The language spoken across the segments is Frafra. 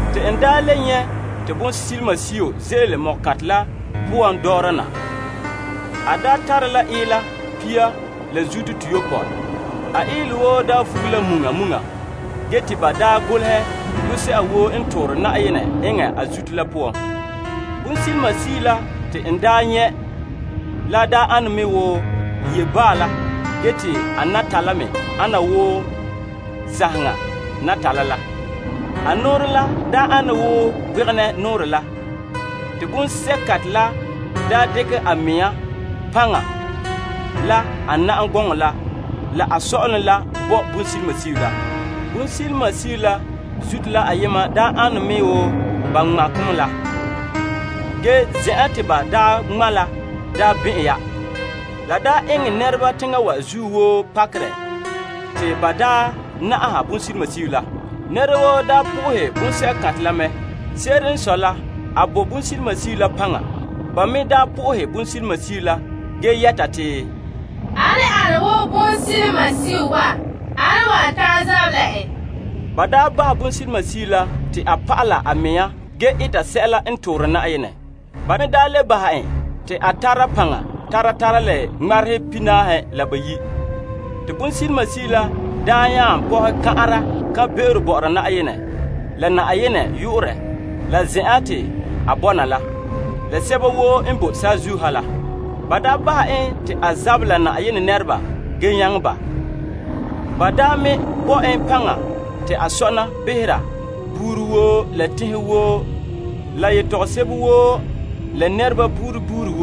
Te n le nyɛ' te bonsilimasio ze'ele ko'kantɛ la poan dɔɔra na. A tare la ila pia la zuto toyopɔe. A ilɛ woo vuge la muŋa muŋa ge te ba daa golehɛ yu'urɛ se'a woo n toore Yenɛ eŋɛ a zuto la poan. Bonsilimasio la te n nyɛ' la ane me wo yeobaa la te a natala me ana wo sanheŋa natala la. A nɔɔrɛ la ane wo gbegenɛ nɔɔrɛ la. Te bonsɛ'kantɛ la dekɛ a mea paŋa, la a na'am gɔŋɔ la, la a sɔ'ɔlom la bo bonsilimasio la. Bonsilimasio la zuto la ayema n ane me wo ba ŋmɛ' ko' me la. Ge zen'an te ba ŋmɛ' la bɛn'ɛn ya. La eŋɛ nɛreba teŋa wa zuo woo pakerɛ te ba naha bonsilimasio la. Nɛra woo po'ohɛ bonsɛ'kantɛ la mɛ. Se'ere n sɔe la, a bo bonsilimasio la paŋa. Ba me na'aha bonsilimasio la ge yɛta te, Ane n wo bonsilimasio wa? Ane n wan ta'an zabɛ la en? Ba bahɛ bonsilimasio la te a pa'ala a mɛŋa ge eta sɛla n toore Yenɛ. Ba me le bahɛ en te a tara paŋa tara tara la ŋmarehe pihinaahe la bayi'. Te bonsilimasio la nya pɔhɛ kan'ara kan'be'ero bɔ'ɔra Yenɛ, la Yenɛ yu'urɛ, la zen'an te a bɔna la, la sɛba woo n bo saazuo ha la. Ba bahɛ en te a zabɛ la Yenɛ nɛreba ge nyaŋɛ ba. Ba me bo en paŋa te a sɔna behera buuri woo, la tenhen woo la yetɔgom sebo woo, la nɛreba buuri buuri.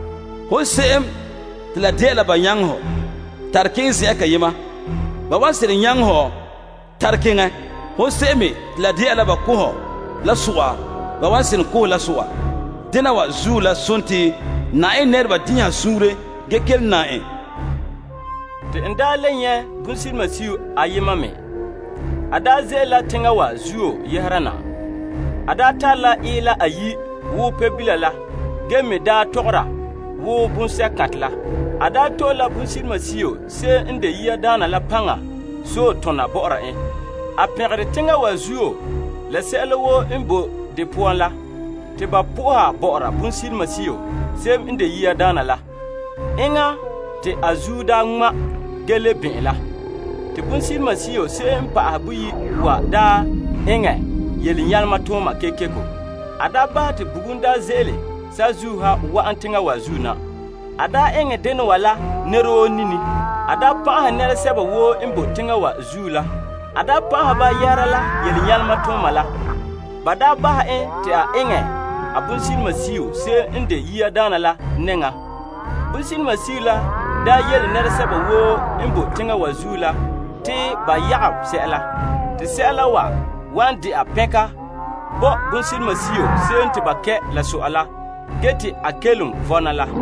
Hon se'em te la dɛna la ba nyaŋɛ ho, tare keŋɛ zen'an kayema, ba wan seren nyaŋɛ hɔ tare keŋɛ. Hon se'em me te la dɛna la ba ko' hɔ la so'a, ba wan seren ko' hɔ la so'a. Dena wa zuo la sontii, Yenɛ nɛreba din'inha suunre ge kelom nam en. Te n le nyɛ' bonsilimasio ayema me ze'ele la teŋa wa zuo yɛhera na. A tare la ila ayi' wo Pebila la ge me daa tɔgɔra wo bonsɛ'kantɛ la. A to'e la bonsilimasio se'em n de yiadaana la paŋa sɔe tona bɔ'ɔra en. A pɛngerɛ teŋa wa zuo la sɛla woo n bo de poan la te ba na'aha bonsilimasio se'em n de yiadaana. Enŋa te a zuo daa ŋma' ge le bɔn'ɛn la. Te bonsilimasio se'em n pa'ahɛ boyi' wa eŋɛ yelenyalema kekeko. A bahɛ te bugum daa ze'ele saazuo ha wa'an teŋa wa zuo na. A eŋɛ dena wa la nɛra woo nini. A pan'ahɛ nɛresɛba woo n bo teŋa wa zuo la. A pan'ahɛ ba yɛhera la yelenyalema tooma la te a tom bonsilimasio se'em n de yiadaana la nɛŋa. Bonsilimasio la yele nɛresɛba woo n boe teŋa wa zuo la te ba yagom sɛla wan dɛna pɛnka bo bonsilimasio se'em te ba kɛ' la so'a la, ge te a kelom vɔna la.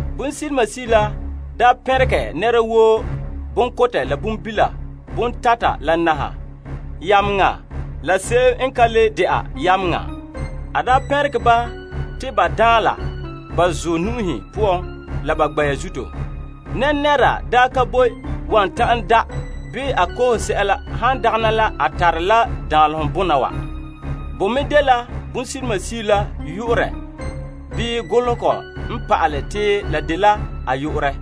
Bonsilimasio la pɛnregɛ nɛra woo, bonkotɛ la bonbila, bontata la naha, yameŋa la se'em n dagɛ yameŋa, te ba daanla ba zuɔ nu'uhen poan la ba gbɛ'ɛra zuto. Nɛnɛra ka boe wan ta'an da' bii a koohe sɛla han dagɛna la a tare la danlehom bona wa. Bo me dela bonsilimasio la yu'urɛ bii golehegɔ n pa'ale te la dela a yu'urɛ.